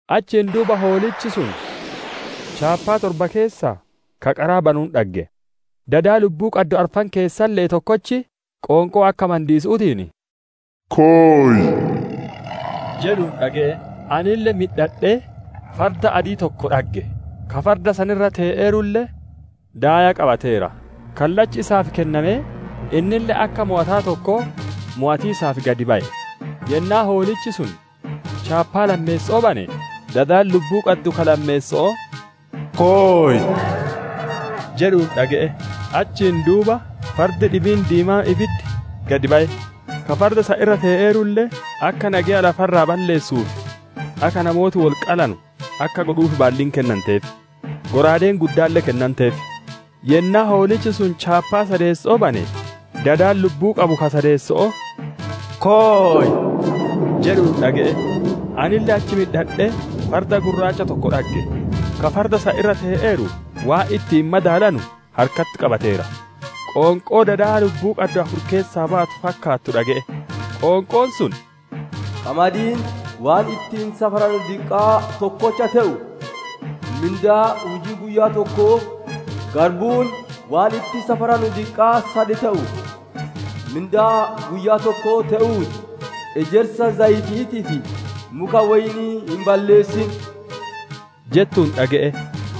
Achiin duuba Hoolichi sun chaappaa torba keessaa ka qaraa banuun dhagge; dada lubbuu qaddu arfan keessalle'ee tokkochi qoonqoo akka mandiisu'uutiin, «Koy!» jedhuun dhage'e. Anille midhadhee, farda adii tokko dhagge; ka farda san irra tee'eerulle guubee qabateera; kallachi isaaf kennamee, innille akka mowataa tokkoo mowatiisaaf gad baye. Yennaa Hoolichi sun chaappaa lammeessoo bane, dadi lubbuu qabu ka lammeesso'oo, «Koy!» jedhuun dhage'e. Achiin duuba fardi dhibiin diimaan ibiddi gad baye; ka farda san irra tee'eerulle, akka nageya lafa irraa balleessuu fi akka namooti wol qalanu akka godhuuf baalliin kennanteef; shallaagaan guddaalle kennameef. Yennaa Hoolichi sun chaappaa sadeesso'oo bane, dadi lubbuu qabu ka sadeesso'oo, «Koy!» jedhuun dhage'e. Anille achi midhadhee farda gurraacha tokko dhagge; ka farda san irra tee'eeru waan ittiin madaalanu harkatti qabateera. Qoonqoo dada lubbuu qaddu afur keessaa baatu fakkaattu dhage'e; qoonqoon sun, «Qamadiin waan ittiin safaranu diqqaa tokkocha te'u mindaa hujii guyyaa tokkoo, garbuun waan ittiin safaranu diqqaa sad te'u mindaa guyyaa tokkoo te'uu ti! Ejersa zayiti'iitii fi muka woynii hin balleessin» jettuun dhage'e.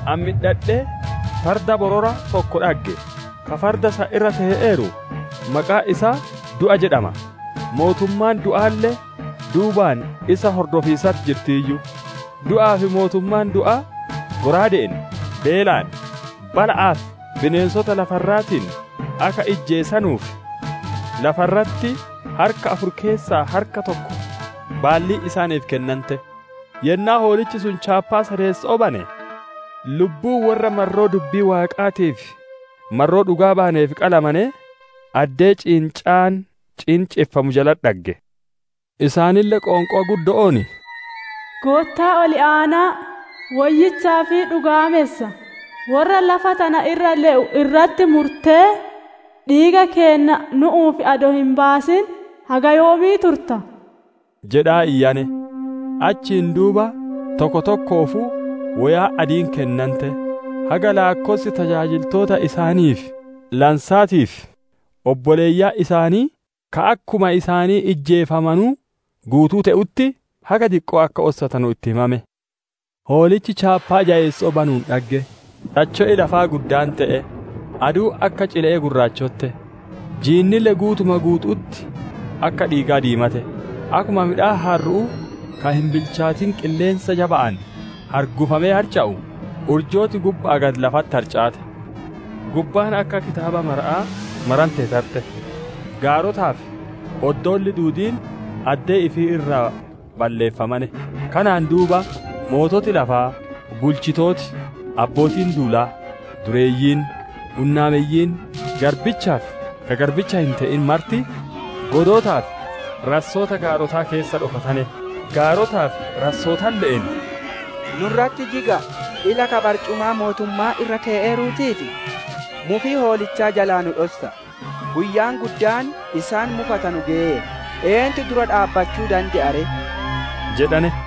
Ani midhadhee, farda borora tokko dhagge; ka farda san irra tee'eeru maqaan isaa, «Du'a» jedhama; mootummaan du'aalle duubaan isa hordofiisatti jirtiiyyu. Du'aa fi mootummaan du'aa shallaaga'aan, beelaan, bala'aa fi bineensota lafa irraatiin akka ijjeesanuuf, lafa irratti harka afur keessaa harka tokko baalliin isaaniif kennante. Yennaa Hoolichi sun chaappaa shaneesso'oo bane, lubbuu worra marroo Dubbii Waaqaatii fi marroo dhugaa bayaneef qalamanee, addee ciincaan ciinceffamu jalatti dhagge. Isaanille qoonqoo guddo'oon, «Goottaa Ol Aana'a, woyyichaa fi dhugaamessa, worra lafa tana irra le'u irratti murtee, dhiiga keenna nu'uuf adoo hin baasin, haga yoomii turta?» jedhaa iyyane. Achiin duuba tokkoo tokkoofuu woyaan adiin kennante; haga laakkossi tajaajiltoota isaaniif lansaatii fi obboleeyyan isaanii, ka akkuma isaanii ijjeefamanuu guutuu te'utti, haga diqqoo akka ossatanu itti himame. Hoolichi chaappaa jayeesso'oo banuun dhagge. Tacho'i lafaa guddaan te'e; aduun akka cile'ee gurraachotte; jiinille guutuma guutu'utti akka dhiigaa diimate. Akkuma midhaan harru'uu ka hin bilchaatin qilleensa jaba'aan hargufamee harca'u, urjooti gubba'aa gadi lafatti harcaate. Gubbaan akka kitaaba marama'aa marantee tarte; gaarotaa fi oddoolli duudiin addee ifii irraa balleeffamane. Kanaan duuba, moototi lafaa, bulchitooti, abbootiin duulaa, dureeyyiin, hunnaameyyiin, garbichaa fi ka garbicha hin te'in marti, godootaa fi rassoota gaarotaa keessa dhokatane. Gaarotaa fi rassootalle'een, «Nu irratti jiga'a, ila ka barcumaa mootumma'aa irra tee'eeruutii fi mufii Hoolichaa jalaa nu dhossa'a. Guyyaan guddaan isaan mufatanu geyeera; eentu dura dhaabbachuu dande'aa ree?» jedhane.